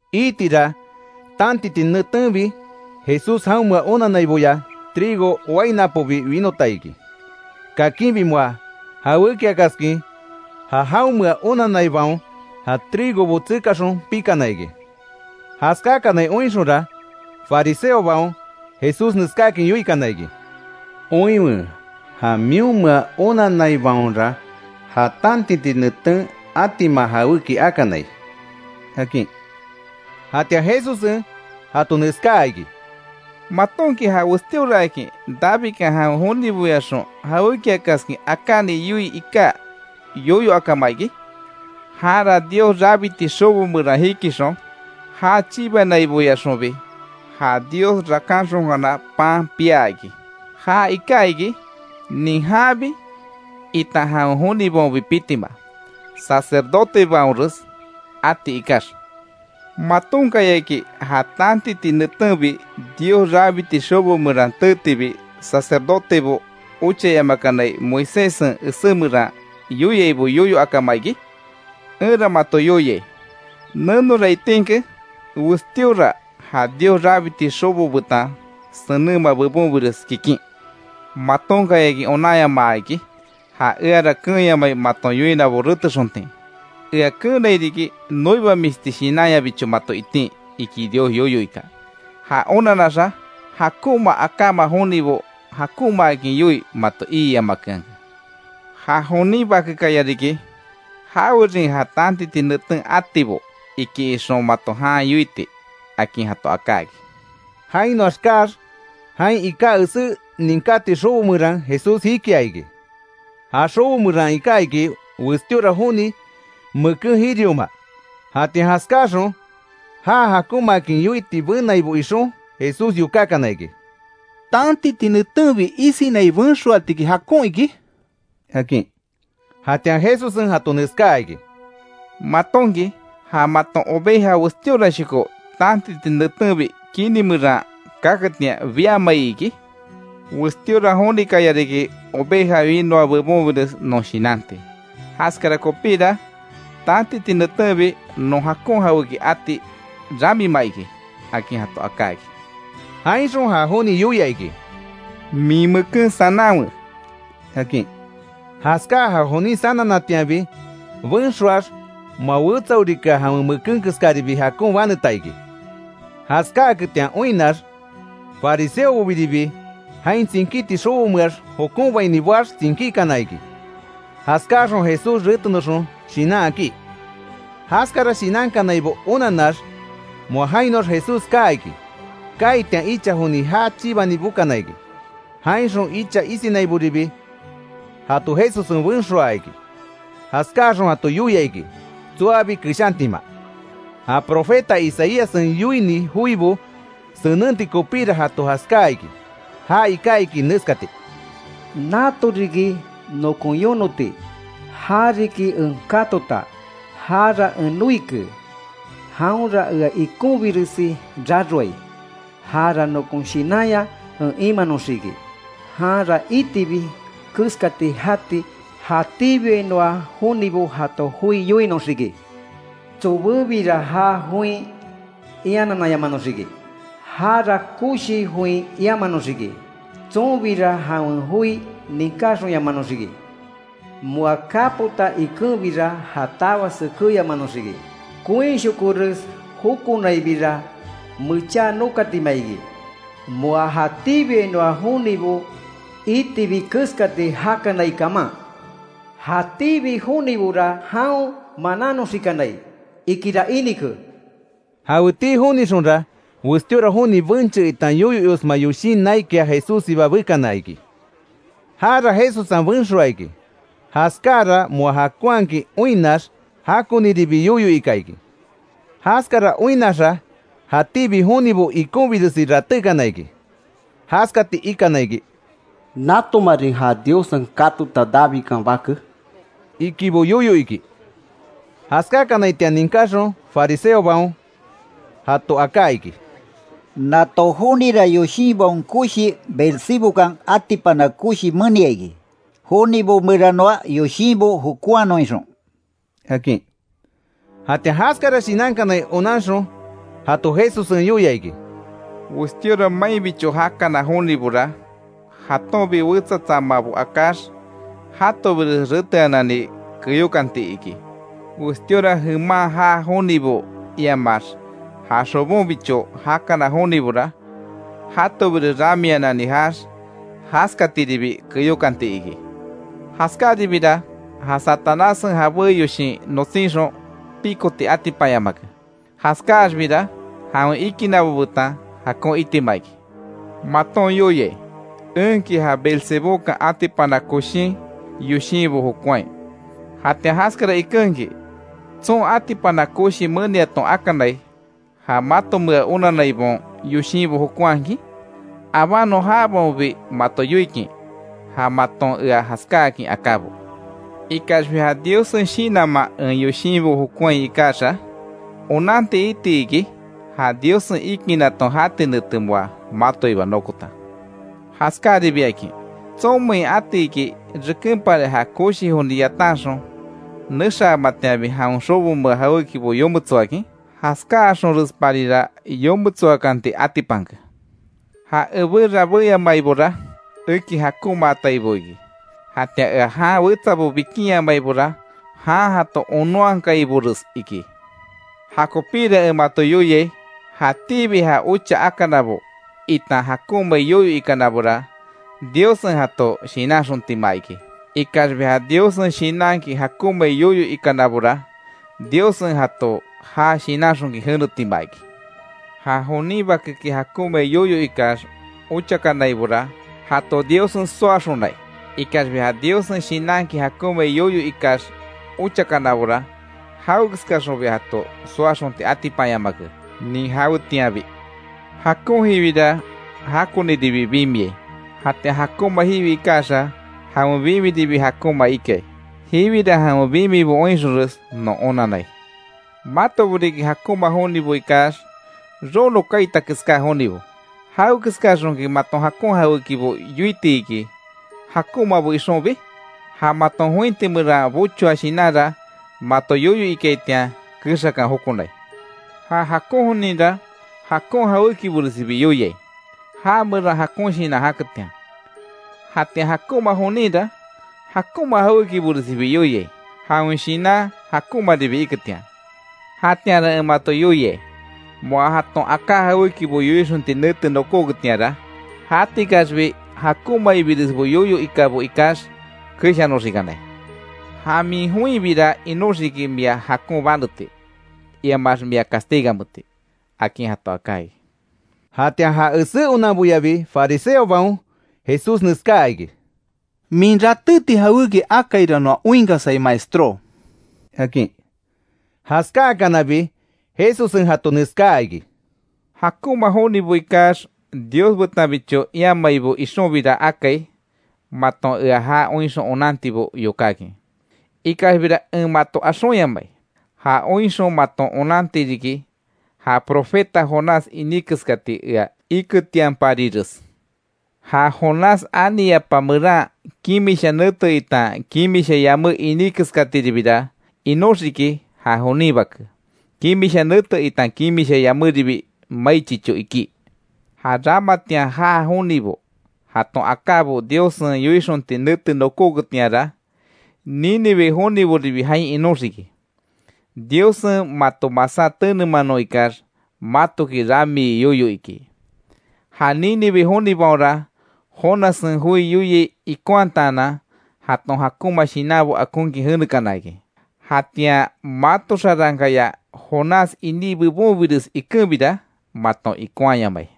Iitira, tantiti netenbi Jesús jaonmea onanaiboya trigo wainapobi winota iki. Kakinbi moa jawékiakaskin ja jaonmea onanaibaon ja trigobo tsekaxon pikana iki. Jaskáakanai oinxonra, fariseobaon Jesús neskáakin yoikana iki: —Oinwe, ja mionmea onanaibaonra ja tantiti neten atima jawéki akanai —akin. Jatian Jesussen jato neskáa iki: —¿Matonki ja westíoraakin Davidkan jawen joniboyaxon jawékiakaskin akáni yoii iká yoyo akama iki? Janra, Dios rabiti xobo meran jikixon, já chibanaiboyaxonbi, ja Dios rakanxonkana pan piá iki. Ja iká iki nin janbi itan jawen jonibaonbi pitima, sacerdotebaonres ati ikax. ¿Matonkayaki ja tantiti netenbi Dios rabiti xobo meran teetibi, sacerdotebo ochayamakanai, Moiséssen esé meran yoiaibo yoyo akama iki? Enra mato yoiai: Nenora itinke westíora ja Dios rabiti xobo betan senenma bebonbires kikin. Matonkayaki onanyamaa iki: ‘Ja eara keenyamai maton yoinabo retexontin. Ea keenai riki noibamisti shinanyabicho mato itin’, iki Dios yoyo ika. Ja onanaxa, jakonma akáma jonibo jakonmaakin yoii mato iiyamakeanke. Ja jonin Bakekaya riki jawerin ja tantiti neten atibo iki ixon mato jan yoiti —akin jato aká iki. Jainoax kaax, jain iká esé ninkáti xobo meran Jesús jikia iki. Ja xobo meran iká iki, westíora joni meken jirioma. Jatian jaskáaxon já jakonmaakin yoiti benaibo ixon, Jesús yokákana iki: —¿Tantiti netenbi isinai benxoatiki jakon iki? —akin. Jatian Jesussen jato neskaa iki: —¿Matonki, ja maton oveja westíorashoko tantiti netenbi kini meran kaketian, biamai iki? Westíora jonikaya riki oveja winoa bebonbires non shinanti. Jaskara kopíra, tantiti netenbi non jakon jawéki ati ramima iki —akin jato aká iki. Jainxon ja joni yoia iki: —Min meken sananwe —akin. Jaskáa ja jonin sananatianbi benxoax, moa wetsaorikea jawen meken keskaribi jakon baneta iki. Jaskáaketian oinnax, fariseobobiribi jain tsinkíti xobomeax jokonbaini boax tsinkíkana iki, jaskáaxon Jesús retenoxon shinan akí. Jaskara shinankanaibo onanax, moa jainoax Jesús kaa iki. Kaaitian icha joni já chibani bokana iki. Jainxon icha isinaiboribi, jato Jesussen benxoaa iki. Jaskáaxon jato yoia iki tsoabi keshantima. Ja profeta Isaíassen yoini joibo senenti kopíra jato jaskáa iki. Ja iká iki neskati: “Natoriki nokon yonoti, ja riki en katota, jara en noike, jaonra ea ikonbiresi raroai. Jara nokon Shinanya en imanoxiki. Janra itibi keskati jati jatíbiainoa jonibo jato joi yoinoxiki. Tsobebira já join ianananyamanoxiki. Jara koshi join iamanoxiki. Tsonbira jawen joi ninkáyamanoxiki. Moa kapota ikenbira ja tawa sekeyamanoxiki. Koinshokores jokonainbira mecha nokaatima iki, moa jatíbiainoa jonibo itibi keskati jakanai kaman. Jatíbi jonibora jaon manánoxikanai”, ikira inike. Jaweti jonixonra, westíora joni benche itan yoyo iosma yoshin naikia Jesússiba bekana iki. Jara Jesussen benxoaa iki. Jaskáara moa jakonhakin oinnax, jakoniribi yoyo ika iki. Jaskara oinnaxa, jatíbi jonibo ikonbiresi ratékana iki. Jaskati ikana iki: “¿Natomarin ja Diossen katota Davidkan Bake?” ikibo yoyo iki. Jaskákanaitian ninkáxon, fariseobaon jato aká iki: “Nato jonira yoshinbaon koshi Beelzebúkan atipana koshi menia iki, jonibo meranoa yoshinbo jokonhanon ixon”, akin. Jatian jaskara shinankanai onanxon jato Jesussen yoia iki: “Westíora mainbicho jakana jonibora, jatonbi wetsa tsamabo akáx jatobires reteanani keyókanti iki. Westíora jeman jaa jonibo iamax ja xobonbicho jakana jonibora, jatobires ramianani jaax, jaskatiribi keyokanti iki. Jaskáribira, ja Satanássen jabé yoshin notsínxon pikoti atipanyamake. Jaskaxbira jawen ikinabo betan jakon itima iki. Maton yoiai, enki ja Beezebúkan atipana koshin yoshinbo jokonhai; jatian jaskara ikenki ¿Tson atipana koshi meniaton akanai, ja matomea onanaibaon yoshinbo jokonhakin? Abánon jabaonbi mato yoikin ja maton ea jaskáakin akábo. Ikaxbi ja Diossen Shinanman en yoshinbo jokonhai ikaxa, onanti iti iki ja Diossen ikinaton jati nete moa matoiba nokota. Jaskaribiakin ¿Tsonmein atiki, rekenpari ja koshi joni yatanxon nexaamatianbi jawen xobomea jawékibo yometsoakin? Jaskáaxonresparira yometsoakanti atipanke. Ja ebé rabéyamaibora, eki jakonmaataibo iki. Jatian ea jan wetsabo bikinyamaibora, jan jato onónhakaibores iki. Jakopíra en mato yoiai: Jatíbi ja ocha akanabo itan jakonmai yoyo ikanabora, Diossen jato shinanxontima iki. Ikaxbi ja Diossen Shinanki jakonmai yoyo ikanabora, Diossen jato ja shinanxonkin jenetima iki. Ja jonin Bakeki jakonmai yoyo ikax ochakanaibora, jato Diossen soaxonai. Ikaxbi ja Diossen Shinanki jakonmai yoyo ikax ochakanabora, jawekeskaxonbi jato soaxonti atipanyamake, nin jawetianbi. Jakon jiwira, jakoniribi bimiai; jatian jakonma jiwi ikaxa, jawen bimiribi jakonma ikai. Jiwira jawen bimibo oinxonres non onanai. ¡Matobo riki, jakonmabo ikax, rono kaita keská jonibo! ¿Jawekeskaxonki maton jakon jawékibo yoiti iki jakonmabo ixonbi? Ja maton jointi meran bochoa shinanra, mato yoyo ikaitian kexakan jokonai. Ja jakon joninra, jakon jawékiboresibi yoiai; já meran jakon shinan jaketian. Jatian jakonma joninra, jakonma jawékiboresibi yoiai; jawen shinan jakonmaribi iketian. Jatianra en mato yoiai: Moa jaton aká jawékibo yoixonti nete nokóketianra, jatikaxbi jakonmairesbo yoyo ikabo ikax keshanoxikanai. Ja min joinbira inoxiki, mia jakon baneti iamax mia castigameti”, akin jato aká iki. Jatian ja esé onanboyabi fariseobaon Jesús neskáa iki: —Min ratéti jawéki akaira noa oinkasai maestró —akin. Jaskáakanabi Jesussen jato neskáa iki: —Jakonma jonibo ikax Dios betanbicho iamaibo ixonbira akai, maton ea ja oinxon onantibo yokákin. Ikaxbira en mato axonyamai. Ja oinxon maton onanti riki, ja profeta Jonás iní keskati ea iketianparires. Ja Jonás ani yapa meran, kimisha nete itan kimisha yamé iní keskatiribira inoxiki, ja jonin Bake, kimisha nete itan kimisha yaméribi mai chicho ikí. Ja ramatian jaa jonibo jaton akábo Diossen yoixonti nete nokóketianra, Nínive joniboribi jain inoxiki, Diossen mato masá tenemanon ikax matoki ramii yoyo iki. Ja Nínive jonibaonra Jonassen joi yoiai ikonhataanan, jaton jakonma shinanbo akonkin jenekana iki. Jatian mato xarankaya Jonás iní bebonbires ikenbira maton ikonhayamai.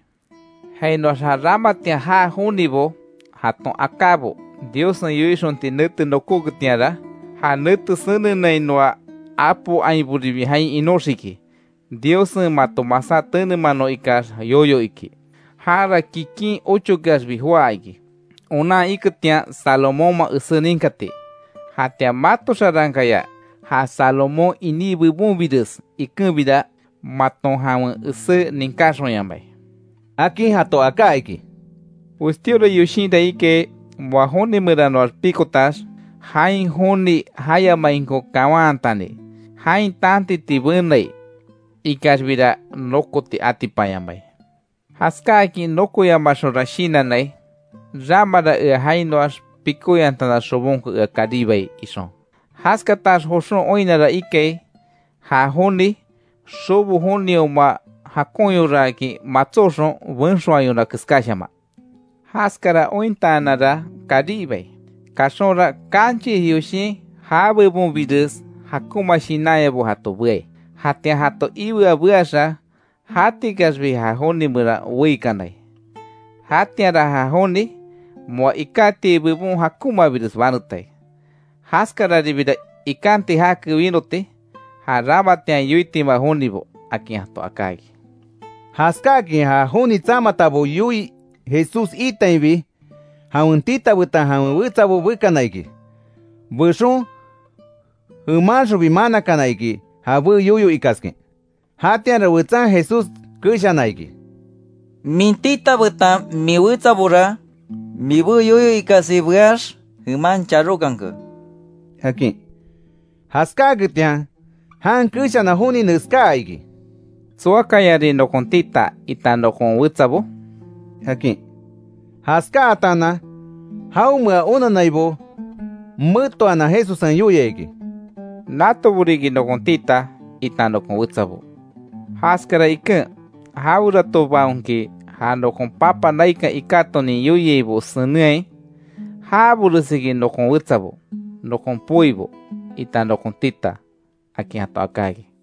Jainoax ja ramatian jaa jonibo jaton akábo Diossen yoixonti nete nokóketianra, ja nete senenainoa apo ainboribi jain inóxiki, Diossen mato masá tenemanon ikax yoyo iki. Jara kikin ochokeaxbi joá iki, onan iketian Salomónman esé ninkati. Jatian mato xarankaya ja Salomón iní bebonbires ikenbira, maton jawen esé ninkáxonyamai —akin jato aká iki. “Westíora yoshinra ikai, moa joni meranoax pikotax, jain joni jayamainko kawanhatani, jain tantiti benai. Ikaxbira nokoti atipanyamai. Jaskáakin nokoyamaxonra shinannai: ‘Ramara ea jainoax pikóyantana xobonko ea karibai’, ixon. Jaskatax joxon oinnara ikai ja joni, xobo jonioma, jakonyoraakin matsóxon, benxoayona keskáshaman. Jaskara ointaananra karibai, kaxonra kanchis yoshin ja bebonbires jakonma shinanyabo jato beai. Jatian jato iwea beaxa, jatikaxbi ja joni meran weíkanai. Jatianra ja joni, moa ikátiai bebon jakonmabires banetai. Jaskararibira ikanti jake winoti ja ramatian yoitima jonibo”, akin jato aká iki. Jaskáakin ja joni tsamatabo yoii Jesús iitainbi, jawen tita betan jawen wetsabo bekana iki. Bexon jemanxonbi manakana iki jabé yoyo ikaskin. Jatianra wetsan Jesús keshana iki: —Min tita betan min wetsabora, mibé yoyo ikasi beax, jeman charókanke —akin. Jaskáaketian jan keshana joni neskáa iki: —¿Tsoakayarin nokon tita, itan nokon wetsabo? —akin. Jaskátaanan, jaonmea onannaibo metoanan Jesussen yoia iki: —Natobo riki nokon tita, itan nokon wetsabo. Jaskara iken, jaweratobaonki ja nokon Papa naikan ikátonin yoiaibo senenhai, jaboresiki nokon wetsabo, nokon poibo, itan nokon tita —akin jato aká iki.